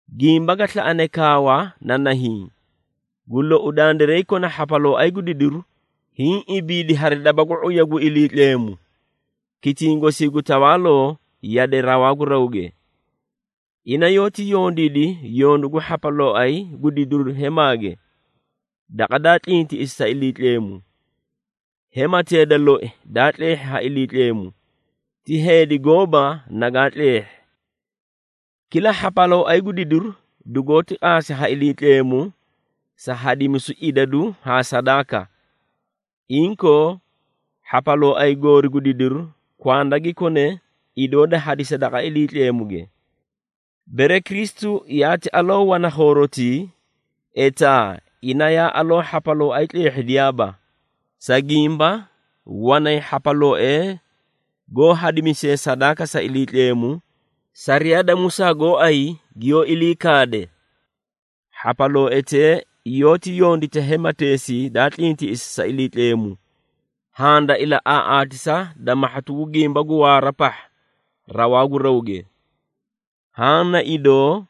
Gimba ga slaꞌane kaawa na nahiĩ. Gu lou, dandiray kona hhapalooay gu didiru, hiĩ ibiidi hari daba gu ⁄uya gu Iliitleemu, kitiĩ gosii gu tawaaloo yade rawaa gu rawge. Ina yoóti yondiidi yondu gu hhapalooay gu didiru hemaage, daqa daa tlintiꞌisi sa Iliitleemu. Hematee da loi daa tleehhi ha Iliitleemu, ti heedi gooba nagaa tleehhi. Kila hhapalooay gu didiru dugoóti qaasi ha Iliitleemu sa hadimisu idadu haa sadaaka. Inkoo, hhapalooay goori gu didiru, kwanda gi kone idoo da hadisa daqa Iliitleemuge. Bere Kristu yaati aloo wana khoorotii, etaa ina yaa aloo hhapalooay tleehhidiyaaba, sa gimba wanay hhapalooee goó hadimisee sadaaka sa Iliitleemu, sariyaa da Musaa gooay giyoó ilii kaade. Hhapalooetee yoóti yondita hemateesii daa tlintiꞌisi sa Iliitleemu, haã da ilaꞌaaꞌaatisa da mahhatu gu gimba gu waara pahha rawaa gu rawge. Haã na idoo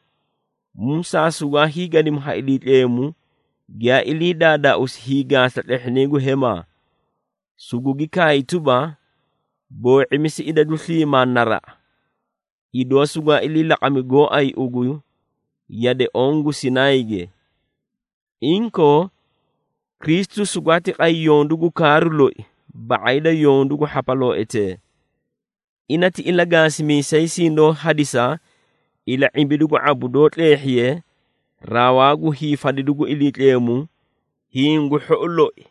Musaa sugwaa hiigadimi ha Iliitleemu giyaa ilii daadaausi hiigaasa tlehhinay gu hemaa, sugugi kaay tuba, “Khuꞌumi, boo⁄imisi idadu goõ naraꞌa, idoo sugwaa ilii laqami gooay ugu yade onke.” Inkoo, Kristu sugwaati qay yondu gu kaaru loi ba⁄ay da yondu gu hhapalooetee. Ina ti ilagaasimiisay sindoó hadisa ila⁄imbidu gu ⁄abu doó tleehhiye rawaa gu hiifadidu gu Iliitleemu hiĩ gu hhou loi.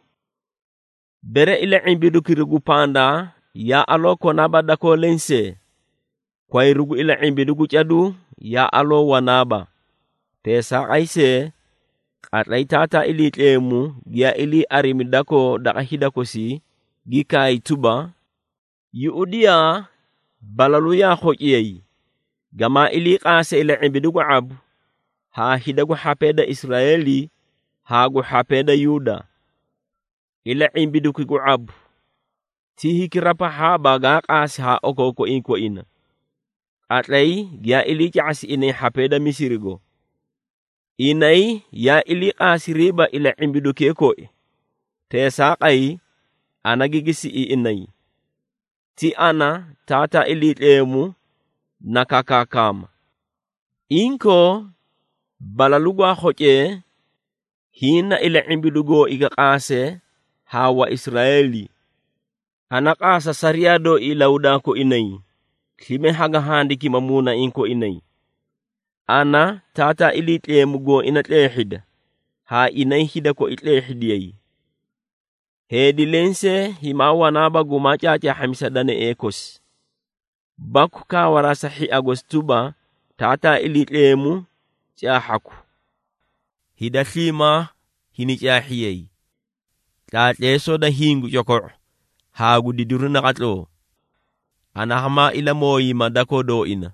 Bere ila⁄imbidukira gu pandaa yaa aloo konaaba dakoo lensee, kwayru gu ila⁄imbidu gu caduu yaa aloo wanaaba. Teesaaqay see, qatlay Taataa Iliitleemu giyaa ilii arimi dakoo daqa hida kosii, gi kaay tuba, “Yuꞌudiyaa! Balalu yaa khociyay, gamaa ilii qaase ila⁄imbidu gu ⁄abu haa hida gu hhapee da Israeeli haa gu hhapee da Yuuda. Ila⁄imbiduki gu ⁄abu, ti hikira pahhaaba gaa qaasi haa okookoiĩ koina, qatlay giyaa iliica⁄asi inay hhapee da Misirigo. Inay yaa iliiqaasiriiba ila⁄imbidukee koi, teesaaqay, ana gigi siꞌi inay. Ti ana, Taataa Iliitleemu na kakaakama. Inkoo, balalu gwaa khocee, hiĩ na ila⁄imbidu gooi ga qaase haa Waisraeeli. Ana qaasa sariyaa dooi ilahudaa koinay, slime haga handikima muunaiĩ koinay. Ana, Taataa Iliitleemu gooina tleehhida, haa inay hida koi tleehhidiyay. Heedi lensee himaa wanaaba gumaa caacaahhamisa danaee kosi, baku kaawaraa sa hhia gosi tuba, ‘Taataa Iliitleemu caahhaku.’ Hida sliimaa hini caahhiyay, tlaatleesoo da hiĩ gu coko⁄u haa gu didiru naqatloo. Ana hamaa ilamooyima dakoo dooina,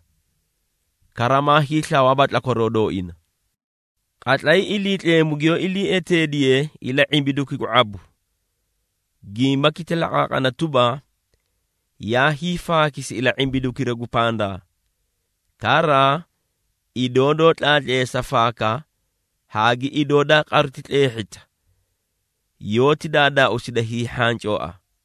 kara maa hiislawaaba tlakwaroo dooina.” Qatlay Iliitleemu giyoó ilii eteediye ila⁄imbiduki gu ⁄abu, gimbaki ti laqaaqana tuba, yaa hiifaakisi ila⁄imbidukira gu pandaa. Kara idoo doó tlaatleesa faaka haa gi idoo daa qaruti tleehhita, yoóti daadaausida hiihhancooa.